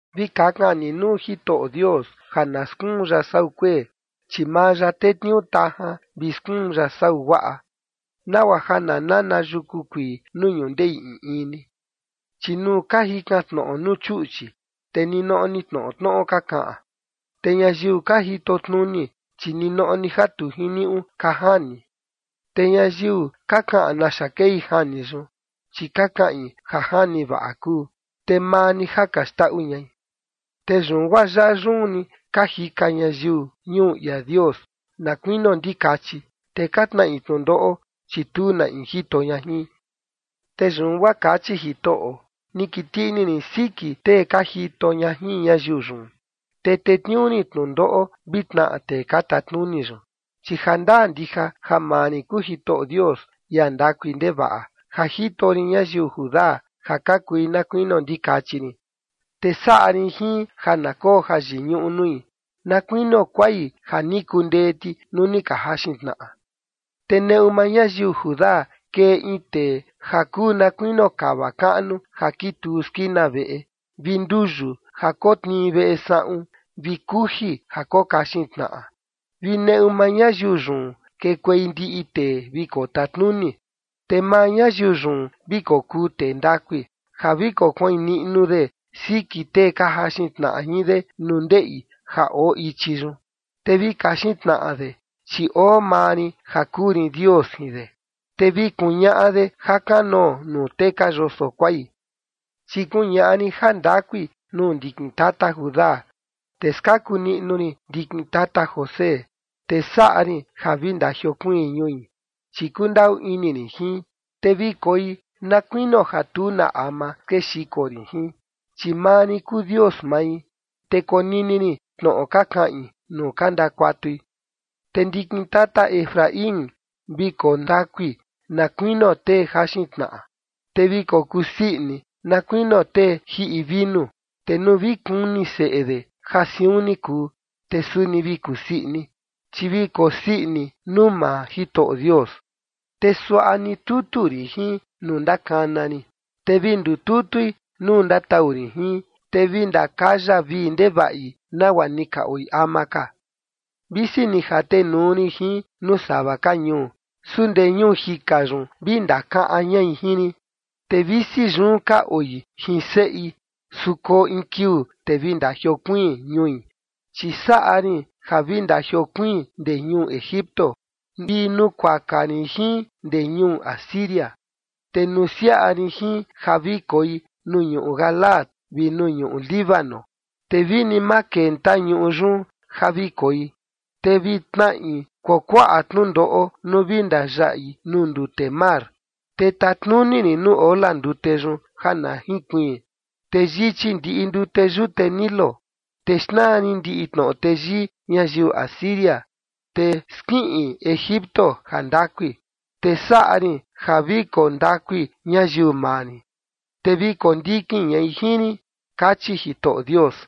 Vi kakan ni nuu Jitoꞌo Dios ja na skuun ya sau kuee, chi maa ya tetniuu tajan vi skuun ya sau guaꞌa, nagua ja na nana yuku kuii nuu ñundeꞌi in in ni. Chi nuu ka jikan tnoꞌo nuu chuꞌchi, te ninoꞌo ni tnoꞌo tnoꞌo ka kaꞌan, te ñayiu ka jitotnuni, chi ninoꞌo ni ja tu jiniuꞌu ka jani, te ñayiu ka kaꞌan naxa kei jani yun, chi ka kaꞌin ja jani vaꞌa kuu, te maa ni ja ka xndaꞌu ñai. Te yun guaa yaꞌa yun ni ka jika ñayiu ñuu ia Dios na kuinio ndikachi, te ka tnaꞌi tnundoꞌo, chi tu na in jito ña jin. Te yun guaa kachi Jitoꞌo: Ni kiti ini rin siki tee ka jito ña jin ñayiu yun, te tetniuu rin tnundoꞌo vi tnaꞌa tee ka tatnuni yun, chi jandaa ndija ja maa rin kuu Jitoꞌo Dios, ia ndakui ndevaꞌa, ja jito rin ñayiu Judá ja ka kui na kunio ndikachi rin, te saꞌa rin jin ja na koo jayiñuꞌu nui na kuinio kuai ja ni kundee ti nuu ni ka jaxin tnaꞌa. Te neꞌu maa ñayiu Judá kee in tee ja kuu na kuinio kava kaꞌnu ja kituu skina veꞌe, vi nduyu ja kotnii veꞌe saꞌun, vi kuji ja kokaxin tnaꞌa, vi neꞌu maa ñayiu yun kekuei ndiꞌi tee vi kotatnuni. Te maa ñayiu yun vi kokuu tee ndakui, ja vi kokuain niꞌnu de siki tee ka jaxin tnaꞌa jin de nuu ndeꞌi ja oo ichi yun, te vi kaxin tnaꞌa de, chi oo maa rin ja kuu rin Dios jin de, te vi kuñaꞌa de jakanoo nuu tee ka yoso kuai. Chi kuñaꞌa rin jandakui nuu ndikin tata Judá, te skaku niꞌnu rin ndikin tata José, te saꞌa rin ja vi ndajiokuiin ñui, chi kundaꞌu ini rin jin, te vi koi na kuinio ja tu na ama skexiko rin jin, chi maa rin kuu Dios mai, te konini rin tnoꞌo ka kaꞌin nuu ka ndakuatui. Te ndikin tata Efraín vi koo ndakui na kuinio tee jaxin tnaꞌa, te vi kokuu sii ini, na kuinio tee jiꞌi vinu. Te nuu vi kuni seꞌe de ja siun ni kuu, te suni vi kusii ini, chi vi kosii ini nuu maa Jitoꞌo Dios. Te suaꞌa ni tutu rin jin nuu ndakana rin, te vi ndututui nuu ndatau rin jin, te vi ndakaya vii ndevaꞌi, nagua ni ka oi ama ka. Visi ni jatenuu rin jin nuu sava ka ñuu, su ndee ñuu jika yun vi ndakaꞌan ñai jin rin, te visi yun ka oi jin seꞌi, su koo in kiuu, te vi ndajiokuiin ñui. Chi saꞌa rin ja vi ndajiokuiin ndee ñuu Egipto vi nukuaka rin jin ndee ñuu Asiria, te nusiaꞌa rin jin ja vi koi nuu ñuꞌu Galaad vi nuu ñuꞌu Líbano, te vi ni ma kenta ñuꞌu yun ja vi koi. Te vi tnaꞌi kuakuaꞌa tnundoꞌo nuu vi ndayaꞌi nuu ndute mar, te tatnuni rin nuu ola ndute yun ja na jinkuiin, te yichi ndiꞌi ndute yute Nilo, te xnaa rin ndiꞌi tnoꞌo teyii ñayiu Asiria, te skiꞌin Egipto jandakui. Te saꞌa rin ja vi koo ndakui ñayiu maa rin, te vi kondikin ñai jin rin, kachi Jitoꞌo Dios.